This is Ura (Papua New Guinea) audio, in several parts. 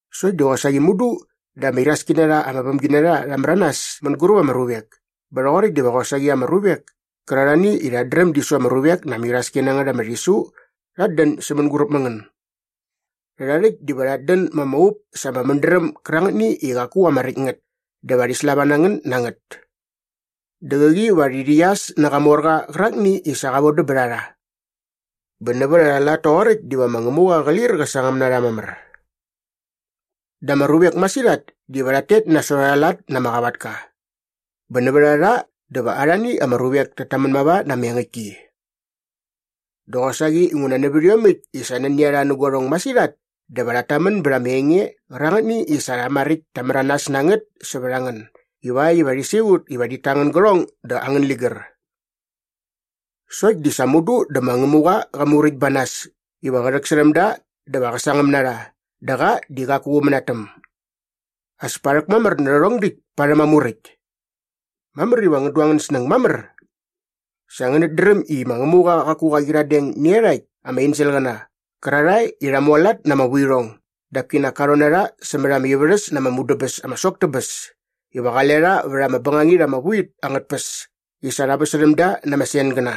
Sokt di qosaqi mudu dä ama iraski na rha ama vämginarha rha märanas mänguräp ama ruvek bä rhoqoräkt diva qosaqi ama ruvek kärarhani i rhat dräm di su ama ruvek na ama iraski na ngät ama rhisu rhat dän sä mänguräp mä ngän. Rhärha rhäkt diva rhat dän ma ama up sa ama mädräm gärangätni i qaku ama räkt ngät dä va rhi slava na ngän na ngät. Dä qäqi va rhi rhäqyas nä Qamorqa qärakni i sa qa vodäm bät a rha. Bä nävät arha lat toqoräkt diva ma Ngämuqa qä lir qä sangäm na rha mamär. Dä ama ruvek masirhat diva rhat tet nasot arha lat na ama qavatka bä nävät a rha dä va arhani ama ruvek tat tamän mava na ama engäktki. Dä qosaqi inguna nävät iomäkt i sa nani a rha nä guarhong masirhat dä va rhat tamän bät ama enge qärangätni i sa rha maräkt ta märanas na ngät sävät a ngän ivakt iva rhi siqut iva rhit ta angän gärhong dä angän ligär. Sokt di sa mudu dä ma Ngämuqa qa muräkt ba nas iva qä rhäksärhäm da dä va qä sangäm na rha dä qa di qaku qä mänatäm. As pa rhäkmamär nä rhärhong däkt parhäm aa muräkt. Mamär iva ngän du angän snäng mamär. Sa ngänät dräm i ma Ngämuqa qaku qa qyiradeng nä iarhakt ama enselqäna qärarhae i rha mualat na ama vuirhong dap kinak ka rhon na rha sämät ama ivärhäs na ama mudäbäs ama sok tä bäs iva qale rha vät ama bängangit ama vu it angät tpäs i sa rha väsärhäm da na ama sengäna.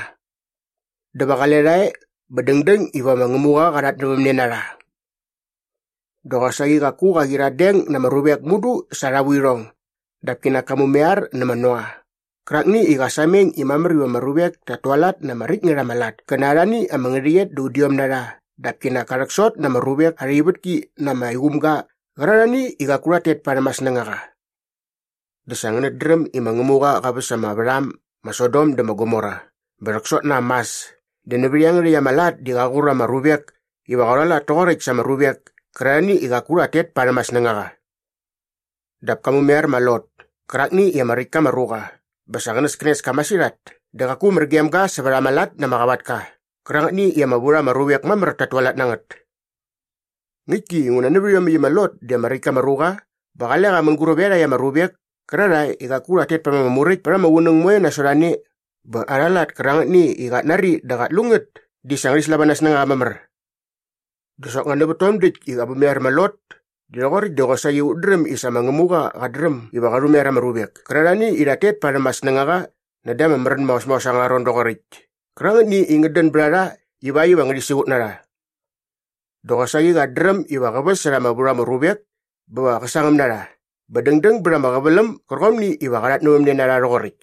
Dä va qale rha e bä dängdäng iva ma Ngämuqa qa rhatnävämne na rha. Dä qosaqi qaku qa qyiradeng na ama ruvek mudu sa arha vuirhong dap kinak ka mumaiar nä ma Noa qärakni i qa sameng i mamär iva ama ruvek tat tualat na ama räkt ngät ama lat kä na arhani ama ngärhäqyet da udiom na rha dap kinak ka rhäksot na ama ruvek arha ivätki na ama iqumga qärarhani i qaku rhat tet parhäm aa snängaqa. Dä sa ngänät dräm i ma Ngämuqa qa väs ama värham ma Sodom dä ma Gomora bä rhäksot na am mas dä nävät iangärhäkt ama lat di qa qur ama ruvek iva qa rhualat toqoräkt sa ama ruvek kärarhani i qaku rhat tet parhäm aa snängaqa. Dap ka mumaiar ma Lot kärakni i ama räkt ka ama ruqa bä sa qänäskänes ka masirhat dä qaku mär gem ga sävät ama lat na ama qavatka qärangätni i ama vu rha ama ruvek mamär tat tualat na ngät. Ngäktki inguna nävät iomäkt i ma Lot di ama räkt ka ama ruqa bä qale qa mänguräp iarhakt ama ruvek kärarhae i qaku rhat tet parhäm ama muräkt pät ama qunäng moe nasot a ne bä arha lat kärangätni i qat nari dä qat lu ngät di sa ngärhi slava na aa snängaqa mamär. Dä soknga nävät tom däkt i qa mumaiar ma Lot di rhoqoräkt di qosaqi ut dräm i sa ma Ngämuqa qat dräm iva qa rhumaiar ama ruvek kärarhani i rhat tet parhäm aa snängaqa näda ama märän maos maos angärha ron doqoräkt kärangätni i ngät dän bät a rha ivakt iva ngärhi siqut na rha. Dä qosaqi qat dräm iva qä väsärha ama vu rha ama ruvek bä va qä sangäm na rha bä dängdäng bät ama qäväläm gärqomni iva qa rhatnävämne na rha rhoqoräkt.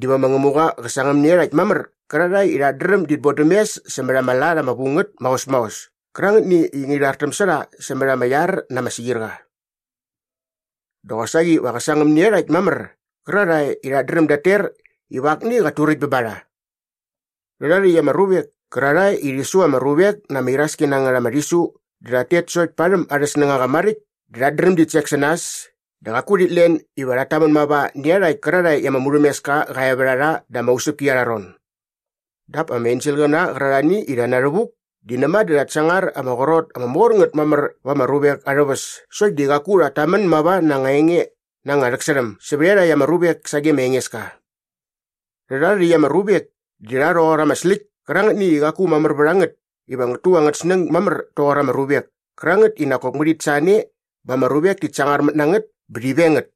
Diva ma Ngämuqa qä sangäm nä iarhakt mamär qärarhae i rhat dräm dit bodäm mes sämät ama lat ama vu ngät maos maos kärangätni i ngärhi rhartäm sä rha sämät ama iar na ama siqirqa. Dä qosaqi va qä sangäm nä iarhakt mamär qärarhae i rhat dräm dat ter iva akni qat turäkt bä ba rha. Rhärha rhäkt ama ruvek kärarhae i rhi su ama ruvek na ama iraski na ngät ama rhisu di rhat tet sokt parhäm arhä snängaqa maräkt dä rhat dräm dit sek sä nas dä qaku rhit len iva rhat tamän mava nä iarhakt kärarhae i ama murhämeska qa e vät a rha da ama usäpki arha ron. Dap ama enselqäna qärarhani i rha na rhävuk di näma dä rhat sangar ama qrot ama mor ngät mamär va ama ruvek arhä väs sokt di qaku rhat tamän mava na anga enge na anga rhäksärhäm sävät iarhakt ama ruvek sage ma Engeska. Rhärha rhäkt ama ruvek di rha rhoqor ama släkt kärangätni i qaku mamär vät a ngät iva ngät tu angät snäng mamär toqor ama ruvek kärangät i nak kop ngärhit sa ne bä ama ruvek tit sangarmät na ngät bä rhi veng ngät.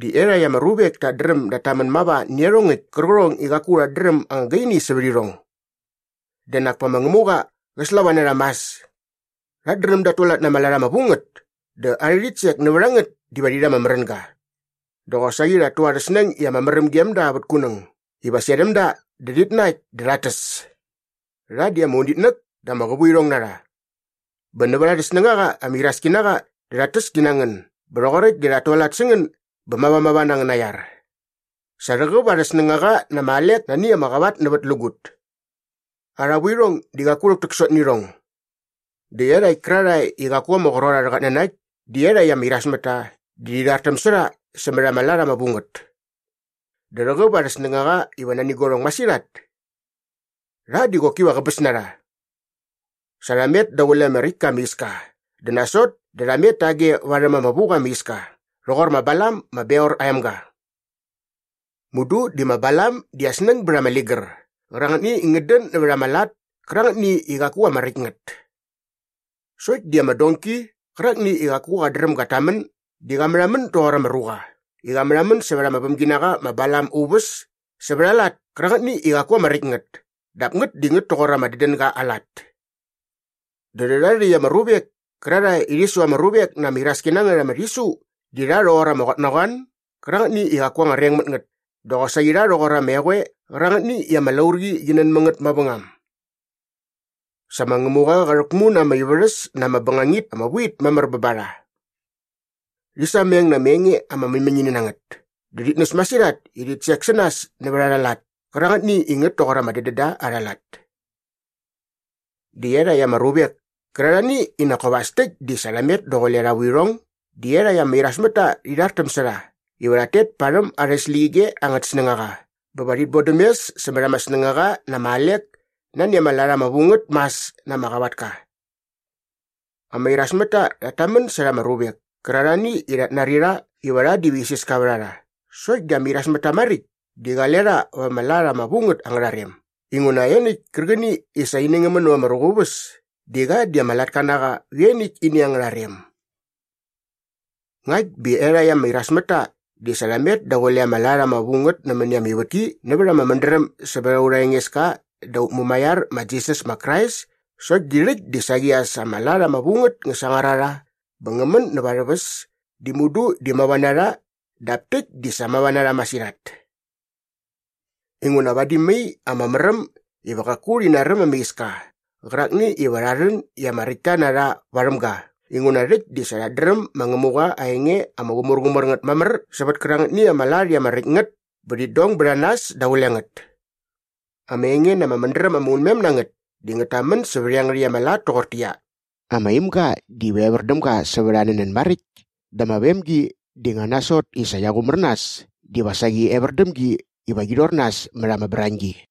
Dä iarhakt ama ruvek tat dräm dat tamän mava nä iarhongäkt kärqärhong i qaku rhat dräm anga gaini sävät irhong. Dä nak pa ma Ngämuqa qä slava na rha mas. Rhat dräm dat tualat na ama lat ama vu ngät dä arhä rhitsek nävät a ngät diva rhi rha ama märänga. Dä qosaqi rhat tu arhä snäng i ama märäm gem da vät kunäng iva serhäm da dä rhit nakt dä rhat täs. Rha di ama unitnäk dä ama qävuirhong na rha. Bä nävät arhä snängaqa ama iraski na qa dä rhat täs ti na ngän bä rhoqoräkt dä rhat tualat sä ngän bä mavamava na angäna iar. Sa rhäqäp arhä snängaqa na ama alek nani ama qavatnävätlägut. Arha vuirhong di qaku rhäktäksot nä irhong. Dä iarhakt kärarhae i qaku ama qrot arhä qatnanakt di iarhakt ama irasmätta di rhi rhartäm sä rha sämät arha lat ama vu ngät. Dä rhäqäp arhä snängaqa iva nani guarhong masirhat. Rha diva qoki qäbäs na rha! Sa rha met daqule ama räkt ka ama iska dä nasot dä rha met tage varhäm ama vu qa ama iska rhoqor ma Balam ma Beor aa emga. Mudu di ma Balam aa snäng bät ama ligär qärangätni i ngät dän nävät ama lat kärangätni i qaku ama räkt ngät. Sokt di ama donki qärakni i qaku qat dräm gat tamän di qa märhamän doqor ama ruqa i qa märhamän sävät ama vämginaqa ma Balam aa uväs sävät aa lat kärangätni i qaku ama räkt ngät dap ngät di ngät toqor ama dädänga aa lat. Dä rhärha rhäkt ama ruvek kärarhae i rhi su ama ruvek na ama iraski na ngät ama rhisu di rha rhoqor ama qotnaqoan gärangätni i qaku anga reng mät ngät dä qosaqi rha rhoqor ama eqoe qärangätni i ama laurqi qi nän mä ngät mavängam. Sa ma Ngämuqa qa rhäkmu na ama ivärhäs na ama bängangit ama vu it mamär bä ba rha. Rhi sameng na ama enge ama mäñmäñini na ngät dä rhit näs masirhat i rhit sek sä nas nävät arha lat kärangätni i ngät toqor ama dädända arha lat. Dä iarhakt ama ruvek kärarhani i nak kop as täkt di sa rha met daqule arha vuirhong di iarhakt ama irasmätta rhi rhartäm sä rha iva rhat tet parhäm arhä släqyige angät snängaqa bä va rhit bodäm mes sämät ama snängaqa na ama alek nani ama lat ama vu ngät mas na ama qavatka. Ama irasmätta rhat tamän särha ama ruvek kärarhani i rhat nari rha iva rha diva isiska vät a rha sokt di ama irasmätta maräkt di qale rha va ama lat ama vu ngät angärha rem inguna ianiäkt kärqäni i sa ini ngä män näva ama ruqa aa uväs di qa di ama latka na qa vä ianiäkt ini angärha rem. Ngakt bä iarhakt ama irasmätta di sa rha met daqule ama lat ama vu ngät nämäni ama ivätki nävät ama mädräm sävät aurha Engeska dä aut Mumaiar ma Jisas ma Krais sokt di rhäkt di saqi as ama lat ama vu ngät ngä sangar a rha bä ngä män näva arhä väs di mudu di mava na rha dap täkt di sa mava na rha masirhat. Inguna vadi mai ama märäm iva qaku rhi naräm ama iska qärakni iva rha rhän i ama räktta na rha varhäm ga inguna rhäkt di sa rhat dräm ma Ngämuqa aa enge ama qumärqumär ngät mamär sävät kärangätni ama lat i ama räkt ngät bä rhit dong bät a nas daqule ngät. Ama enge na ama mädräm ama unmem na ngät di ngät tamän sävät iangärhäkt ama lat toqortäqyia, “Ama imga diva evär däm ga sävät aa nänän maräkt dä ama vemgi di nga nasot i sa qia qumär nas diva saqi evär däm gi iva qi rhor nas mät ama brañgi.”